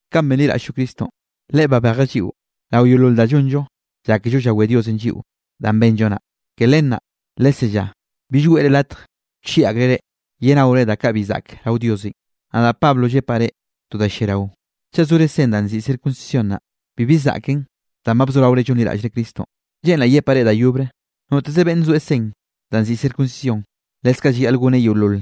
Kanꞌ benliraꞌll-llo Cristonꞌ, Leꞌe babejeꞌ lliꞌo rao yeolol da llonllo llákello llawé Diosenꞌ lliꞌo danꞌ benllo naꞌ. Ke len naꞌ lesellá bill weꞌre latj wchieꞌ akreꞌ reꞌ yenaore da kaꞌ bi zaꞌk rao Diosenꞌ. Nadaꞌ Pablo llepaꞌ reꞌ to da lliarao. Chaꞌ sore sen danꞌ nziꞌi circuncisión naꞌ, bibi zaꞌken danꞌ ba bzoraore llonliraꞌllre Cristonꞌ. Lleꞌnraꞌ yepaꞌ reꞌ da yobre, noteze beꞌnne soeꞌ sen danꞌ nziꞌi circuncisión, lekze llayaꞌl goneꞌ yeolol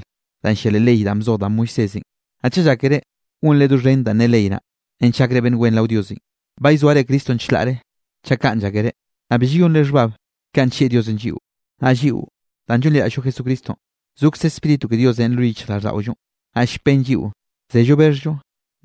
danꞌ llia leꞌ ley danꞌ bzoj da Moisésenꞌ. Naꞌ chaꞌ llákere gonre doxhen danꞌ ne ley naꞌ, nench gakre beꞌnn wen rao Diosenꞌ, ba llzoare Cristonꞌ chlaꞌre chaꞌ kaꞌn llákere, naꞌ bi llayonre xhbab kanꞌ nllieꞌ Diosenꞌ lliꞌo. Naꞌ lliꞌo danꞌ llonliraꞌll-llo Jesucristonꞌ, zokze Spíritu ke Diosenꞌ lo yichjraꞌlldaꞌollonꞌ, naꞌ llpen lliꞌo zello bexhllo,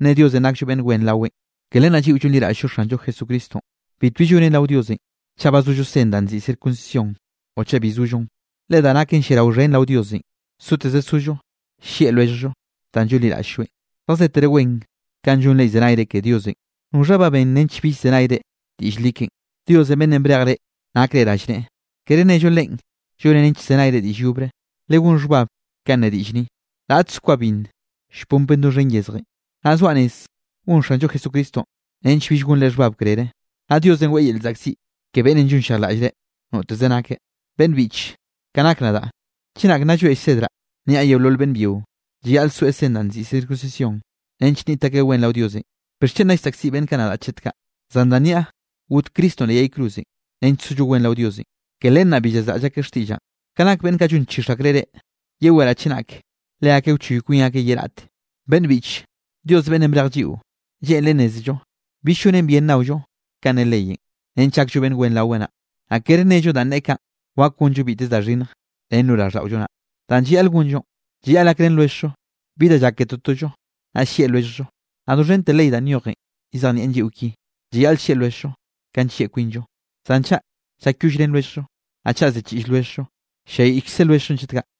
nneꞌe Diosenꞌ nakllo beꞌnn wen raweꞌn. Ke len naꞌ lliꞌo llonliraꞌll-llo Xanllo Jesucristonꞌ, bitbi llonen rao Diosenꞌ chaꞌ ba zollo sen danꞌ nziꞌi circuncisión o chaꞌ bi zollon. Le da naken lliarao xhen rao Diosenꞌ, soteze sollo llieꞌ lwelljllo danꞌ llonliraꞌll-lloeꞌn. Zjazetere wen kanꞌ llonre llzenayre ke Diosenꞌ. ¿Noxhanꞌ ba ben nench bill llzenayre diꞌll li keꞌen? Dios beꞌnnenꞌ brejeꞌ reꞌ nakre rallneꞌe, kere nello Leꞌen llon nench llzenayre diꞌll yobre. Legón xhbab kanꞌ ne diꞌll ni: “Raꞌtze kwa binn llponpen doxhen yezjenꞌ.” Naꞌ zoaꞌ rez gon Xanllo Jesucristonꞌ nench bill gonre xhbab krere, naꞌ Diosenꞌ weꞌe yel llzaꞌkziꞌ ke beꞌnnenꞌ llonllejlaꞌlle reꞌ, noteze nakeꞌ. Beꞌnn biꞌche, ka nak nadaꞌ chenak nna llroeꞌ llsedraꞌ niaꞌ yeolol beꞌnn byio, llayaꞌl soeꞌ sen danꞌ nziꞌi circuncisión nench nniꞌt akeꞌ wen rao Diosenꞌ, ¿bixchen nna llsaꞌkziꞌ beꞌnn kaꞌ nadaꞌ chet kaꞌ? Zan danꞌ niaꞌ got Cristonꞌ leꞌ yay cruzenꞌ nench sollo wen rao Diosenꞌ, ke len naꞌ bi llazraꞌll akeꞌ xtiꞌllaꞌn. Ka nak beꞌnn kaꞌ llon chix akreꞌ reꞌ, yeweraꞌ chenak leakeꞌ wchoy kwin akeꞌ ye raꞌte. Beꞌnn biꞌche, Dios beꞌnnenꞌ brej lliꞌo, lleꞌnreꞌ nnézello bill llonen bien nnaollo kanꞌ ne leyenꞌ nench gakllo beꞌnn wen raweꞌ naꞌ. Naꞌ kere nello danꞌ neꞌe kaꞌn, wak gonllo biteze da xhinnj nen lo raꞌlldaꞌollo naꞌ. Danꞌ llayaꞌl gonllonꞌ, llayaꞌl gakrén lwelljllo bi da llak ke totollo, naꞌ llieꞌ lwelljllo. Naꞌ doxhente ley danꞌ nyojenꞌ llzejnieꞌn lliꞌo ki: “Llayaꞌl llieꞌ lwelljllo ka nllieꞌ kwinllo.” Zan chaꞌ llakyollrén lwelljllo, naꞌ chaꞌ ziꞌchiꞌll lwelljllo, ll-lliayiꞌkze lwelljllonꞌ chet kaꞌ.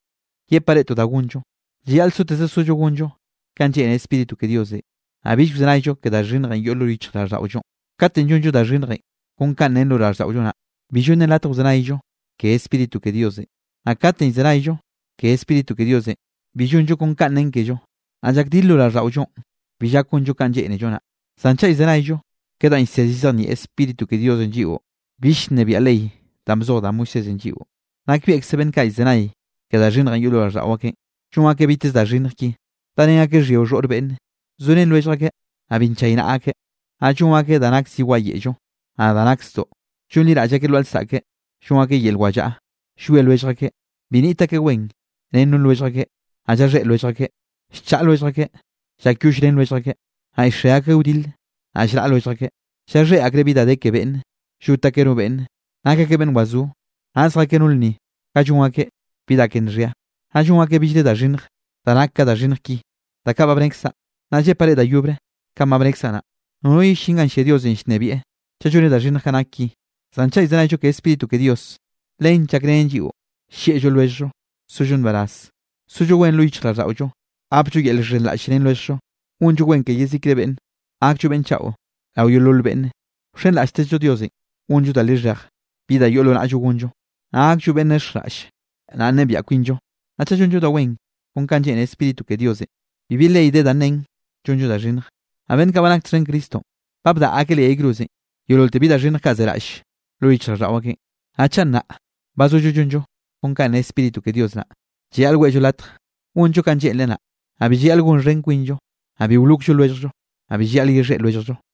Yepaꞌ reꞌ to da gonllo, llayaꞌl soteze sollo gonllo kanꞌ lleꞌne Spíritu ke Diosenꞌ. Naꞌ bill wzenayllo ke da xhinnjenꞌ yoꞌ lo yichjraꞌlldaꞌollonꞌ. Kate llonllo da xhinnjenꞌ kon kanꞌ ne lo raꞌlldaꞌollo naꞌ, bi llonnen latje wzenayllo ke Spíritu ke Diosenꞌ. Naꞌ kate llzenayllo ke Spíritu ke Diosenꞌ, bi llonllo kon kanꞌ nen kello. Naꞌ llakdil lo raꞌlldaꞌollonꞌ, bi llak gonllo kanꞌ lleꞌnello naꞌ. Zan chaꞌ llzenayllo ke danꞌ llsed llzejnieꞌ Spíritu ke Diosenꞌ lliꞌo, bill llnebiaꞌ ley danꞌ bzoj da Moisésenꞌ lliꞌo. Nakbieꞌkze beꞌnn kaꞌ llzenay ke da xhinnjenꞌ yoꞌ lo raꞌlldaꞌo akeꞌn, llon akeꞌ biteze da xhinnj ki: darén akeꞌ xhyio xhoꞌr beꞌnne; zorén lwellj akeꞌ naꞌ bi nchaynaꞌa akeꞌ; naꞌ llon akeꞌ da nak zi wayeꞌllo, naꞌ da nak zdoꞌ; llonliraꞌll akeꞌ lwaꞌa lsaꞌke; llon akeꞌ yel wallaꞌa; llwie lwellj akeꞌ; bi niꞌt akeꞌ wen ren no lwellj akeꞌ; naꞌ llaxhéꞌ lwellj akeꞌ; llchaꞌa lwellj akeꞌ; llakyollrén lwellj akeꞌ; naꞌ llxe akeꞌ wdil; naꞌ llraꞌ lwellj akeꞌ; llaxhéꞌ akreꞌ bi da de ke beꞌnne; llot akeꞌ no beꞌnne; nak akeꞌ beꞌnn wazó; naꞌ zjakeꞌ no lnni ganꞌ llon akeꞌ bi da ke nxhia; naꞌ llon akeꞌ billre da xhinnj da nak ka da xhinnj ki da kaꞌ ba bnekzaꞌ. Naꞌ llepaꞌ reꞌ da yobre kanꞌ ba bnekzaꞌ naꞌ, nono yellín ganꞌ llia Diosenꞌ llnebieꞌ chaꞌ lloneꞌ da xhinnj kaꞌ nak ki. Zan chaꞌ llzenayllo ke Spíritu ke Dios, len llakrenen lliꞌo: llieꞌllo lwelljllo; sollo nbaraz; sollo wen lo yichjraꞌlldaꞌollo; gapllo yel llxhenraꞌll ren lwelljllo; gonllo wen ke yezikre beꞌnne; gakllo beꞌnn chaꞌo rao yeolol beꞌnne; wxenraꞌlltezllo Diosenꞌ gonllo da lixhej bi da yoꞌ lo naꞌllo gonllon; naꞌ gakllo beꞌnn nexjraꞌlle; naꞌ nnebiaꞌ kwinllo. Naꞌ chaꞌ llonllo da wen kon kanꞌ lleꞌne Spíritu ke Diosenꞌ, bibi ley de da nen llonllo da xhinnj. Naꞌ beꞌnn kaꞌ ba nak txhen Cristonꞌ, ba bdaꞌa akeꞌ leꞌ yay cruzenꞌ yeololte bi da xhinnj kaꞌ zeraꞌll lo yichjraꞌlldaꞌo akeꞌn. Naꞌ chaꞌ nnaꞌ ba zollo llonllo kon kanꞌ ne Spíritu ke Dios naꞌ, llayaꞌl weꞌllo latj gonllo kanꞌ lleꞌnreꞌ naꞌ. Naꞌ bi llayaꞌl gonxhen kwinllo, naꞌ bi wlokllo lwelljllo, naꞌ bi llayaꞌl yexhéꞌ lwelljllo.